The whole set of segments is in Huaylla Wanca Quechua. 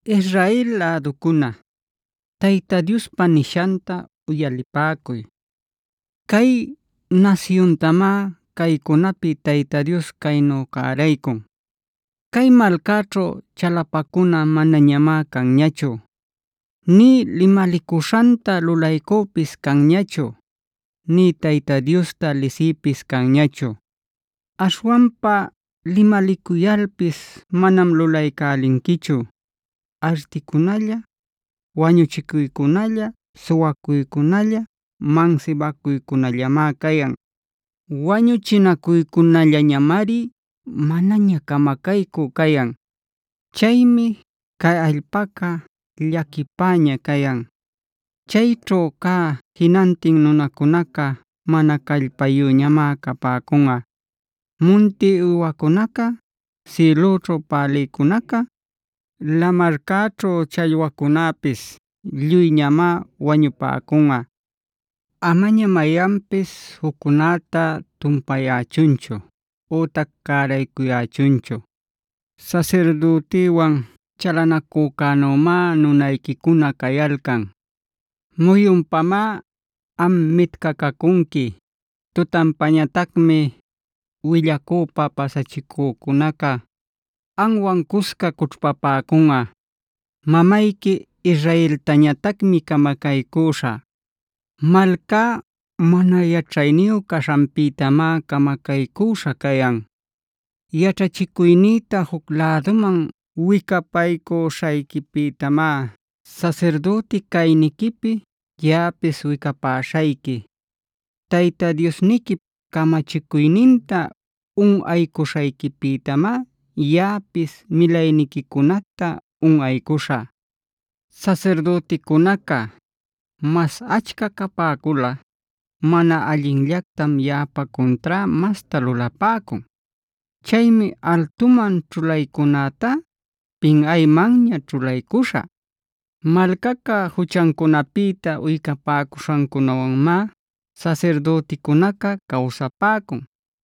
Israel läducuna, Tayta Diospa nishanta uyalipäcuy. Cay nasyuntamá caycunapi Tayta Dios caynu cäraycun: “Cay malcaćhu chalapacuna manañamá canñachu, nï limalicuśhanta lulaycüpis canñachu, nï Tayta Diosta lisïpis canñachu. Aśhwanpa limalicuyalpis manam lulaycälinquichu, articunalla, wañuchinacuycunalla, suwacuycunalla, mansibacuycunallamá cayan. Wañuchinacuycunallamari manaña camacaycü cayan. Chaymi cay allpaca llaquipäña cayan. Chayćhu cä jinantin nunacunaca mana callpayüñamá capäcunꞌa. Munti uywacunaca, sïlüćhu pälïcunaca, lamarcäćhu challwacunäpis lluyñamá wañupäcunꞌa. “Amaña mayanpis juccunäta tumpayächunchu ütac cäraycuyächunchu. Sasirdütiwan chalanacücänümá nunayquicuna cayalcan. Muyunpamá am mitcacacunqui. Tutanpañatacmi willacüpa pasachicücunaca amwan cusca cućhpapäcunꞌa. Mamayqui Israeltañatacmi camacaycüśhä. Malcá mana yaćhayniyu caśhanpïtamá camacaycüśha cayan.a Yaćhachicuynïta juc läduman wicapaycuśhayquipïtamá sasirdüti cayniquipi yaꞌapis wicapäśhayqui. Tayta Diosniquip camachicuyninta unꞌaycuśhayquipïtamá yaꞌapis milayniquicunacta unꞌaycuśhä. “Sasirdüticunaca mas achca capäculꞌa mana allinllactam yaꞌap cuntrá masta lulapäcun. Chaymi altuman ćhulaycunätá pinꞌaymanña ćhulaycuśhä. Malcaca juchancunapïta uycapäcuśhancunawanmá sasirdüticunaca cawsapäcun.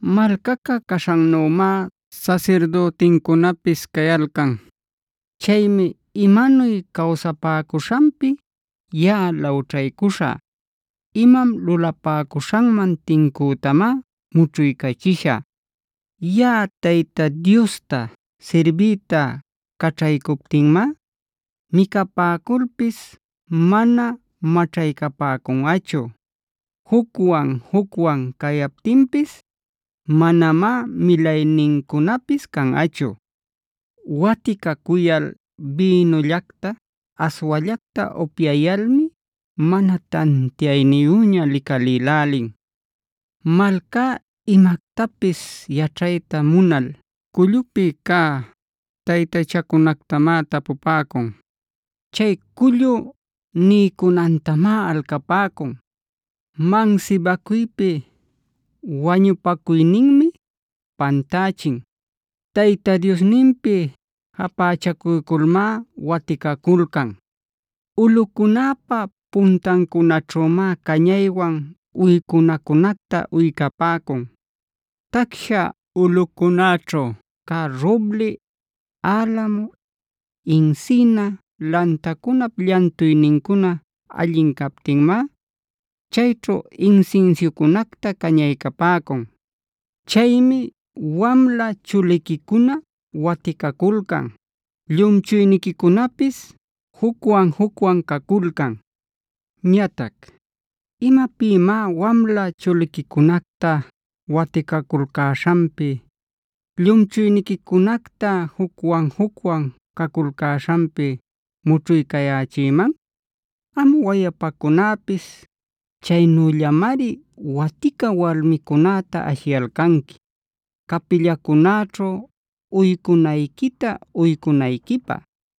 Malcaca caśhannümá sasirdütincunapis cayalcan. Chaymi imanuy cawsapäcuśhanpi yaꞌa lawćhaycuśhä. Imam lulapäcuśhanman tincütamá mućhuycachishä. Yaꞌa Tayta Diosta sirbiyta caćhaycuptinmá micapäculpis mana maćhaycapäcunꞌachu. Jucwan-jucwan cayaptinpis manamá milaynincunapis canꞌachu. “Waticacuyal, bïnullacta, aswallacta upyayalmi mana tantiayniyüña licalïlälin. Malcá imactapis yaćhayta munal cullupi cä taytachacunactamá tapupäcun. Chay cullu niycunantamá alcapäcun. Mansibacuypi wañupacuyninmi pantächin. Tayta Diosninpi japächacuyculmá waticaculcan. Ulꞌucunäpa puntancunaćhümá cañaywan uycunacunacta uycapäcun. Tacsha ulꞌucunäćhu cä roble, alamo, encina lantacunap llantuynincuna allin captinmá chayćhu insinsiucunacta cañaycapäcun. “Chaymi wamla chuliquicuna waticaculcan; llumchuyniquicunapis jucwan-jucwan caculcan. Ñatac ¿imapïmá wamla chuliquicunacta waticaculcäśhanpi, llumchuyniquicunacta jucwan-jucwan caculcäśhanpi mućhuycayächïman? Am wayapacunäpis chaynüllamari watica walmicunäta ashiyalcanqui capillacunäćhu uycunayquita uycunayquipä.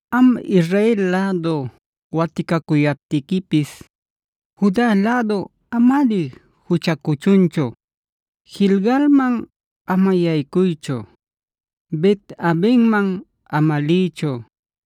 “Am Israel lädu waticacuyaptiquipis Juda lädu amari juchacuchunchu. Gilgalmand ama yaycuychu. Bet-avenmane ama liychu.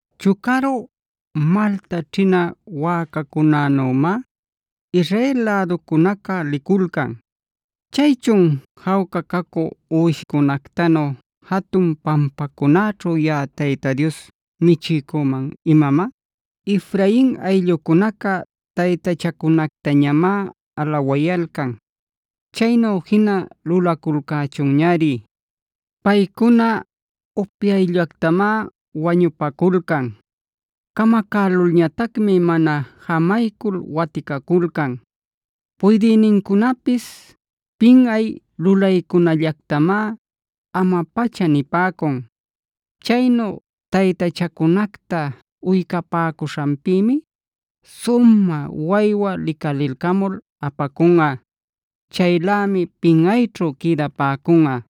Chucaru malta ćhina wäcacunänümá Israel läducunaca liculcan. ¿Chaychun, jawca cacü uwishcunactanu jatun pampacunaćhu yaꞌa Tayta Dios michiycüman imamá? Efraing ayllucunaca taytachacunactañamá alawayalcan. Chaynu jina lulaculcächunñari. Paycuna upyayllactamá wañupaculcan; camacälulñatacmi mana jamaycul waticaculcan. Puydïnincunapis pinꞌay lulaycunallactamá ama-pacha nipäcun. Chaynu taytachancunacta uycapäcuśhanpïmi sumä waywa licalilcamul apacunꞌa. Chaylämi pinꞌayćhu quïdapäcunꞌa.